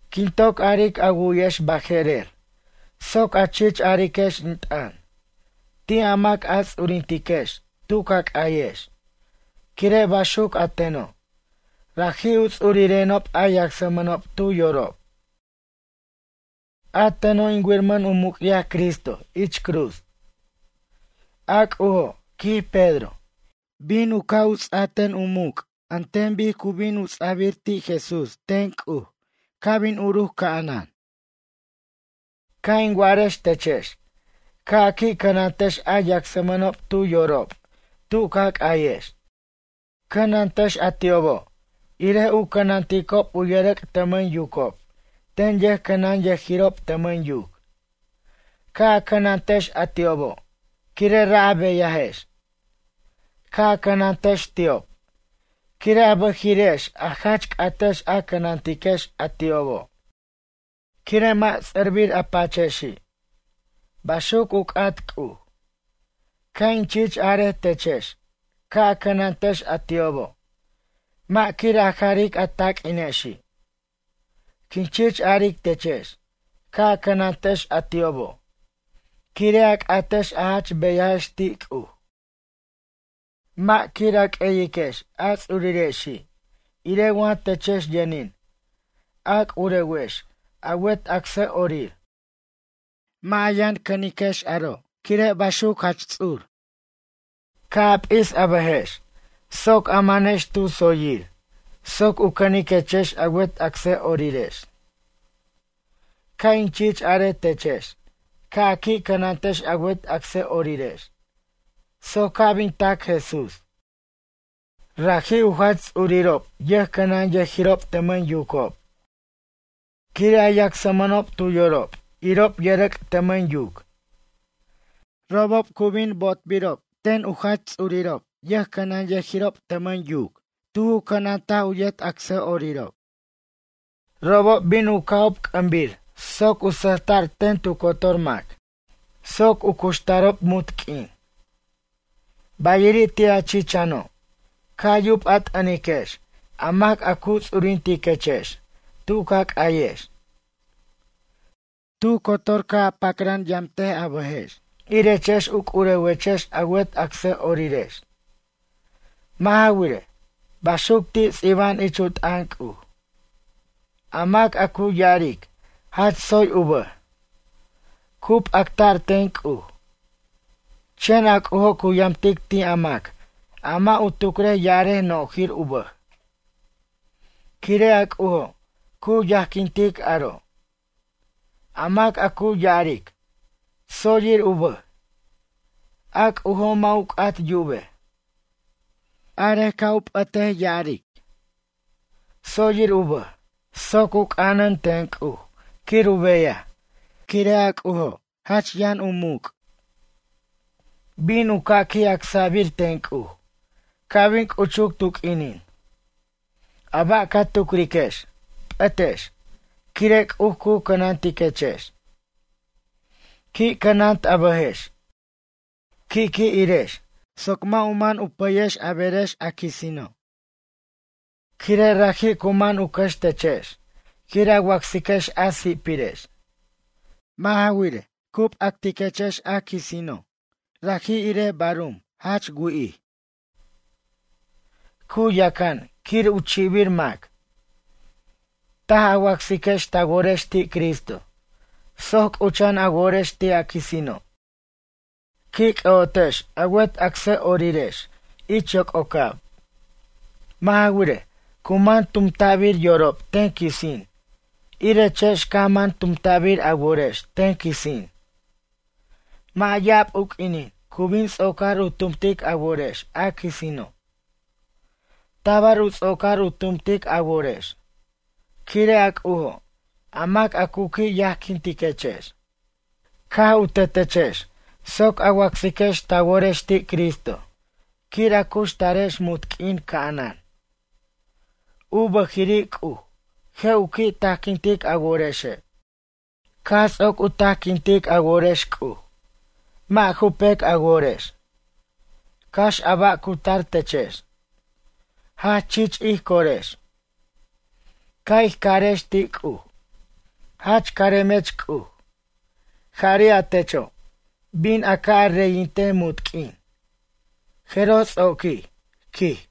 Quin toc aric a wu'yex baje'rer soc a chich ariquex in t'ʌn, ti' a mac a ts'urintiquex tu ca c'ayex, quire' baxuc a teno' raji' u ts'urirenob a yacsmʌnob tu yorob. A teno' in wirmʌn u muc'yaj Cristo ich cruz. A C'ujo', quij Pedro, bin u ca' ts'a ten u muc' an ten bic cu bin u ts'abir ti' Jesús ten C'uj ca' bin uruc ca'anan. Ca' in wa'arex techex ca' a qui' cʌnantex a yacsmʌnob tu yorob tu ca c'ayex. Cʌnantex a ti'obo' irej u cʌnanticob u yʌrʌc' tʌmʌn yucob ten yʌjcʌnʌnyʌjirob tʌmʌn yuc. Ca' a cʌnantex a ti'obo' quire' ra' a beyajex. Ca' a cʌnantex ti'ob quire' a bʌjiri'ex a jach c'atex a cʌnantiquex a ti'obo' quire' mʌ' ts'ʌrbir a pachexi'. Baxuc u c'at C'uj. Ca' in chich arej techex ca' a cʌnantex a ti'obo' mʌ' quir a jaric a taq'uinexi'. Quin chich aric techex ca' a cʌnantex a ti'obo' quire' a c'atex a jach beyajex ti' C'uj. Mʌ' quir a q'ueyiquex a ts'urirexi' irej wa techex yʌnin a c'urewex a wet acsʌ'orir. Mʌ' a yʌn cʌniquex aro' quire' baxuc gente. Ca' a p'is a bʌjex soc a manex tu tsoyir soc u cʌniquechex a wet acsʌ'orirex. Ca' in chich are techex ca' a qui' cʌnantex a wet acsʌ'orirex soc ca' bin tac Jesús. Raji' u Jach Ts'urirob yʌjcʌnanyʌjirob tʌmʌn yucob quire' a yacsmʌnob tu yorob irob yʌrʌc' tʌmʌn yuc. Robob cu bin bo'otbirob ten u Jach Ts'urirob yʌjcʌnanyʌjirob tʌmʌn yuc tu ju cʌnant u yet acsʌ'orirob. Robob bin u ca'ob c'ʌmbir soc u sʌjta'r ten tu cotor mac. Soc u cuxtarob munt q'uin. Bayiri' ti' a chichano', Ca' yub a t'ʌniquex a mac cu ts'urintiquechex tu ca c'ayex. Tu cotor ca' a pacran yamt a bʌjex irechex u c'urewechex a wet acsʌ'orirex. Mʌ' ja wirej. Baxuc ti' ts'iba'an ich u t'ʌn C'uj: A mac a cu ya'aric jach tsoy u bʌj. Cu p'acta'r ten C'uj. Chen a C'ujo' cu yamtic ti' a mac a mʌ' u tucrej ya'arej nojir u bʌj. Quire' a C'ujo' cu yajquintic aro'. A mac a cu ya'aric: “Tsoyir u bʌj”, a C'ujo' mʌ' u c'at yubej. Arej ca' u p'ʌtej ya'aric: “Tsoyir u bʌj.” Soc u c'anan ten C'uj quir u beyaj quire' a C'ujo', jach yʌn u muc'. Bin u ca' qui' acsa'bir ten C'uj ca' bin c'uchuc tu q'uinin. A ba' ca tucriquex, p'ʌtex, quire' C'uj cu cʌnantiquechex. Qui' cʌnant a bʌjex, qui' qui' irex soc mʌ' u man u pʌyex a berex a quisino'. Quire' raji' cu man u cʌxtechex quir a wacsiquex a si'pirex. Mʌ' ja wirej, cu p'actiquechex quisino' raji' irej barum jach wi'ij. Cu yacan quir u chi'bir mac. Taj a wacsiquex ta worex ti Cristo soc c'ucha'an a worex ti' a quisino'. Qui' c'ʌ'otex a wet acsʌ'orirex ich yoc'ocab. Mʌ' ja wirej, cu man tumta'bir yorob ten quisin irechex caj man tumta'bir a worex ten quisin. Mʌ' ya'ab u q'uinin cu bin ts'ocar u tumtic a worex a quisino'. Tabar u ts'ocar u tumtic a worex. Quire' a C'ujo' a mac a cu qui' yajquintiquechex. Caj u tetechex soc a wacsiquex ta worex ti' Cristo, quir a cuxtarex munt q'uin ca'anan. U bʌjiri' C'uj je' u qui' tajquintic a worexe'. Caj ts'oc u tajquintic a worex C'uj, mʌ' ju pec a worex. Cax a ba' cu tar techex, jach chich ij corex. Ca' ij carex ti' C'uj: “Jach caremech C'uj. Jari' a techo', bin a ca' a reyintej munt q'uin. Jeroj ts'oquij, quij.”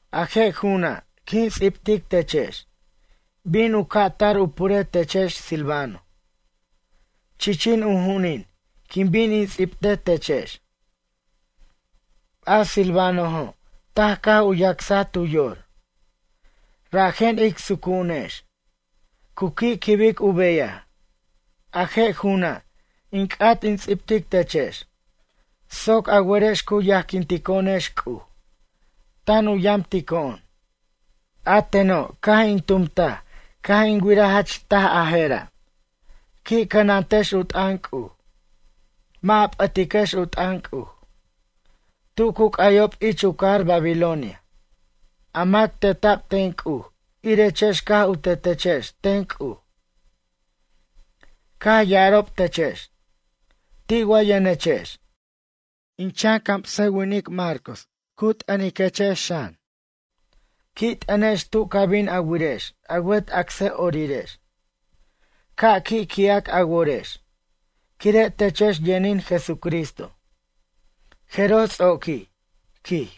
A je' ju'una', quin ts'ibtic techex. Bin u ca' tar u pure techex Silvano. Chichin u ju'unin quin bin in ts'ibte techex. A Silvanojo' taj caj u yacsaj tu yor. Rajen ic sucu'unex. Cu qui' quibic u beyaj. A je' ju'una' in c'at in ts'ibtic techex soc a werex cu yajquintico'onex C'uj, tan u yamtico'on. A teno' caj in tumtaj caj in wiraj jach taj a je'ra'. Qui' cʌnantex u t'ʌn C'uj. Mʌ' a p'ʌtiquex u t'ʌn C'uj. Tu cu c'ayob ich u cajar Babilonia, a mac teta'b ten C'uj irechex caj u tetechex ten C'uj. Caj ya'arob techex: “Ti' wa yʌnechex?” In chan camsʌwinic Marcos ar in t'ʌnechex. Qui' t'ʌnex tu ca bin a wirex a wet acsʌ'orirex. Ca' qui' qui'ac a worex, quire' techex yʌnin Jesucristo. Jeroj ts'oquij, quij.